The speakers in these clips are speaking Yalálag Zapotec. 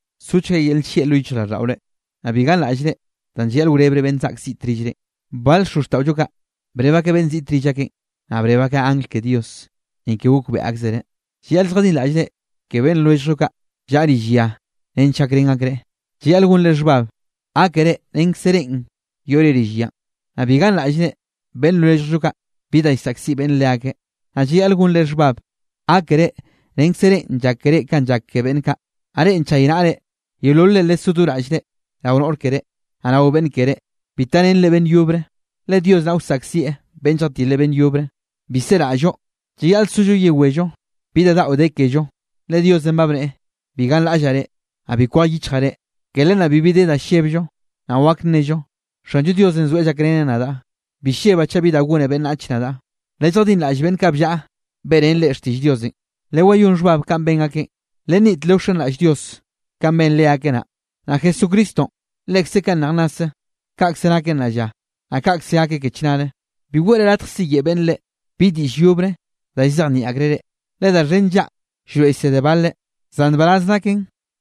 Sochga yel nllieꞌ lo yichjraꞌlldaꞌore. Naꞌ bi ganraꞌllre danꞌ llayaꞌl wrebre beꞌnn zaꞌk ziꞌt rillrenꞌ. Bal xozxtaꞌollo kaꞌ breb akeꞌ beꞌnn ziꞌte rill akeꞌn, naꞌ breb akeꞌ angl ke Dios, ni ke gokbeꞌe akzereꞌ. Llayaꞌl lljadinraꞌllre ke beꞌnn lwelljllo kaꞌ llaꞌa rill ya nench gakrén akreꞌ. Llayaꞌl gonre xhbab, gákere renkze reꞌn yoꞌre rill yanꞌ. Naꞌ bi ganraꞌllre beꞌnn lwelljllo kaꞌ bi da llsaꞌkziꞌ beꞌnne leakeꞌ. Naꞌ llayaꞌl gonre xhbab, gákere renkze reꞌn llak ke reꞌ, kanꞌ llak ke beꞌnn kaꞌ. Naꞌ reꞌ nchaynaꞌre yeololre lesó do raꞌllre rao noꞌr keré, naꞌ rao beꞌnn keré, bi tarenre beꞌnn yobre, le Dios naꞌ wsaꞌkzieꞌ beꞌnn lljatile beꞌnn yobre. Bi seraꞌll-llo, llayaꞌl sollo yewello bi da daꞌo de kello, le Diosenꞌ ba bneꞌe: “Bi ganraꞌllaꞌ reꞌ, naꞌ bi kwej yichjaꞌ reꞌ.” Ke len naꞌ bibi de da llebllo, naꞌ wak nnello: Xanllo Diosenꞌ zoeꞌ llakreneꞌ nadaꞌ. Bi llebaꞌ chaꞌ bi da gone beꞌnnach nadaꞌ. Lelljadinraꞌll beꞌnn kaꞌ bllaꞌa beꞌrén reꞌ xtiꞌll Diosenꞌ. Lewayón xhbab kanꞌ ben akeꞌn, lenniꞌt lewxenraꞌll Dios kanꞌ ben leakeꞌ naꞌ. Naꞌ Jesucristonꞌ lekze kanꞌ nej nnase, kaꞌkze nakeꞌ nnaꞌ lla, naꞌ kaꞌkze gakeꞌ ke chnare. Bi weꞌre latj siyeꞌe beꞌnn reꞌ, bi diꞌll yobre da llzejnieꞌ akreꞌ reꞌ, le da xhen nllaꞌa llroeꞌ llsede baleꞌ. Zan nbaraz naken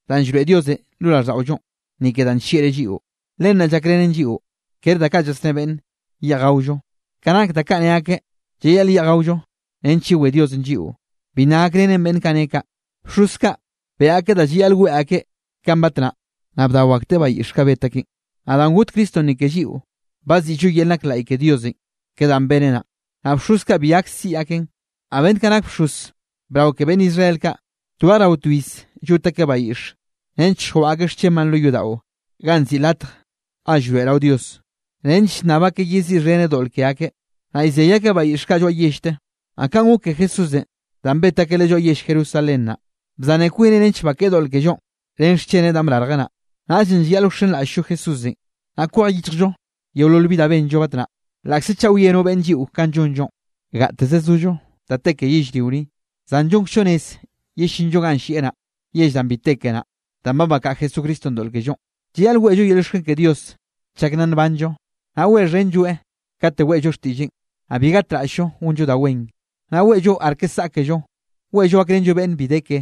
danꞌ llroeꞌ Diosenꞌ lo raꞌlldaꞌollonꞌ, ni ke danꞌ nllieꞌreꞌ lliꞌo, len naꞌ llakrenen lliꞌo, ker da kaꞌ llasné beꞌnne yeꞌj gaollo. Ka nak da kaꞌ ne akeꞌ llayaꞌl yeꞌj gaollo nench yewé Diosenꞌ lliꞌo, bi nna gakrenen beꞌnn kaꞌ ne kaꞌ. Bxoz kaꞌ beꞌe akeꞌ da llayaꞌl weꞌe akeꞌ kanꞌ batnaꞌ, naꞌ bdao akteꞌ bayiꞌx kaꞌ bet akeꞌn. Naꞌ danꞌ got Cristonꞌ ni ke lliꞌo, ba ziꞌllo yel nak laꞌy ke Diosenꞌ ke danꞌ beneꞌ naꞌ. Naꞌ bxoz kaꞌ bi gak siꞌi akeꞌn. Naꞌ beꞌnn kaꞌ nak bxoz brao ke beꞌnn Israel kaꞌ, twej rao to iz llot akeꞌ bayiꞌx, nench lljwaꞌa akeꞌ xchenbaꞌn lo yodaꞌon ganꞌ nziꞌi Latj Ga Llroeꞌrao Dios, nench llnnab akeꞌ yeziꞌxheneꞌ doꞌl ke akeꞌ. Naꞌ llzey akeꞌ bayiꞌx kaꞌ lloaꞌ yellte. Naꞌ kaꞌn gok ke Jesúsenꞌ danꞌ bet akeꞌ Leꞌe lloaꞌ yell Jerusalén naꞌ, bzane kwineꞌ nench naꞌ bakeꞌe doꞌl kellonꞌ ren xcheneꞌ danꞌ brarjeꞌ naꞌ. Naꞌllenꞌ llayaꞌl wxenraꞌll-llo Jesúsenꞌ, naꞌ kwej yichjllo yeolol bi da benllo batnaꞌ, laꞌkze chaꞌ wie no beꞌnn lliꞌo kanꞌ llonllonꞌ. Gateze zollo da te ke yellrio ni, zan llonkzllo rez yellinllo ganꞌ llieꞌ naꞌ, yell danꞌ bi te ke naꞌ. Danꞌ ba bakaꞌa Jesucristonꞌ doꞌl kellonꞌ, llayaꞌl weꞌllo yel llioxken ke Dios chak nna nbanllo, naꞌ weꞌxhenlloeꞌ kate weꞌllo xtiꞌlleꞌn. Naꞌ bi gatraꞌll-llo gonllo da wen, naꞌ weꞌllo arke saꞌkello weꞌllo gakrenllo beꞌnn bi de ke,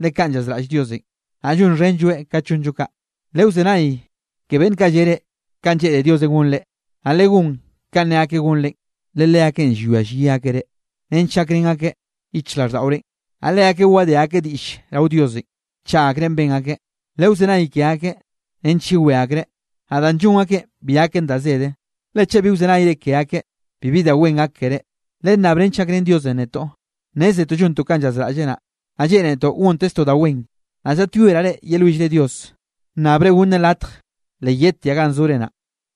le kaꞌn llazraꞌll Diosenꞌ, naꞌ llonxhenlloeꞌ kat llonllo kaꞌ. Lewzenay ke beꞌnn kaꞌ lle reꞌ kanꞌ lleꞌne Diosenꞌ gonre, naꞌ legón kanꞌ ne akeꞌ gonre, le leakeꞌn llwia llyi akeꞌ reꞌ nench gakrén akeꞌ yichjraꞌlldaꞌorenꞌ, naꞌ leakeꞌ wadé akeꞌ diꞌll rao Diosenꞌ, chaꞌ akrenꞌ ben akeꞌ. Lewzenay ke akeꞌ nench yewé akreꞌ, naꞌ danꞌ llon akeꞌn bi gaken da zede, le chaꞌ bi wzenayre ke akeꞌ, bibi da wen gak keré. Lennab nench gakrén Diosenꞌ netoꞌ. Nnézetoꞌ llontoꞌ kanꞌ llazraꞌlleꞌ naꞌ, naꞌ lleꞌnetoꞌ gonteztoꞌ da wen. Naꞌ llaꞌtyoeraꞌ reꞌ yelwillre Dios, nnabre gonneꞌ latj le yedtiaꞌ ganꞌ zore naꞌ.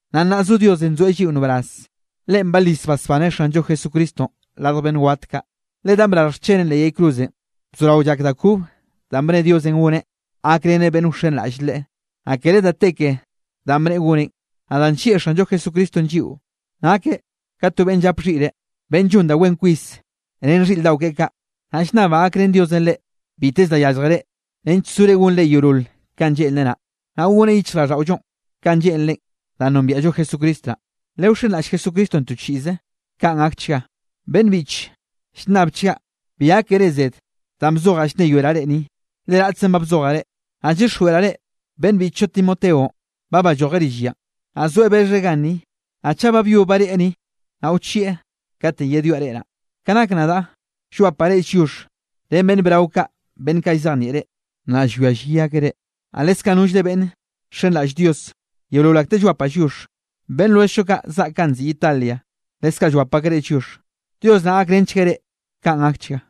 Naꞌ nnaꞌ zo Diosenꞌ nzoeꞌ lliꞌo nbaraz. Leꞌen balis basbaneꞌ Xanllo Jesucristonꞌ radj beꞌnn wat kaꞌ, le danꞌ brarj xcheneꞌn leꞌ yay cruzenꞌ, bzorao llak da kobe da bne Diosenꞌ goneꞌ gakreneꞌ beꞌnn wxenraꞌll Leꞌe. Naꞌ kere da te ke danꞌ bneꞌe goneꞌn. Naꞌ danꞌ nllieꞌ Xanllo Jesucristonꞌ lliꞌo, nakeꞌ ka to beꞌnn llap xhiꞌre, beꞌnn llon da wen kwis ren xhiꞌr daꞌo keꞌe kaꞌ. Naꞌ llnnabaꞌ gakrén Diosenꞌ reꞌ biteze da yálljere nench sore gonre yeolol kanꞌ lleꞌnreꞌ naꞌ, naꞌ goneꞌ yichjraꞌlldaꞌollonꞌ kanꞌ lleꞌnreꞌ, danꞌ nombiaꞌllo Jesucristo naꞌ. Lewxenraꞌll Jesucristonꞌ to chiꞌze. Kaꞌn gakchga. Beꞌnn biꞌche, llnnabchgaꞌ bi gákere zed danꞌ bzojaꞌ llnneyoeraꞌ reꞌ ni, le raꞌtzenꞌ ba bzojaꞌ reꞌ. Naꞌ llyixjweꞌraꞌ reꞌ, beꞌnn biꞌchllo Timoteonꞌ ba ballojeꞌ rill yanꞌ, naꞌ zoaꞌ bexheꞌ ganni. Naꞌ chaꞌ ba byob bareꞌe ni, naꞌ wchieꞌ katenꞌ yedwiaꞌ reꞌ naꞌ. Ka nak nadaꞌ, llwapaꞌ reꞌ lliox ren beꞌnn brao kaꞌ beꞌnn kaꞌ llzejnieꞌ reꞌ, naꞌ llwia llyi akeꞌ reꞌ, naꞌ leskaꞌ nollre beꞌnn nxenraꞌll Dios yeolol akteꞌ llwapaꞌ lliox. Beꞌnn lwelljllo kaꞌ zaꞌk ganꞌ nziꞌi Italia, leskaꞌ llwap akeꞌ reꞌ lliox. Dios naꞌ gakrenchgueꞌ reꞌ. Kaꞌn gakchga.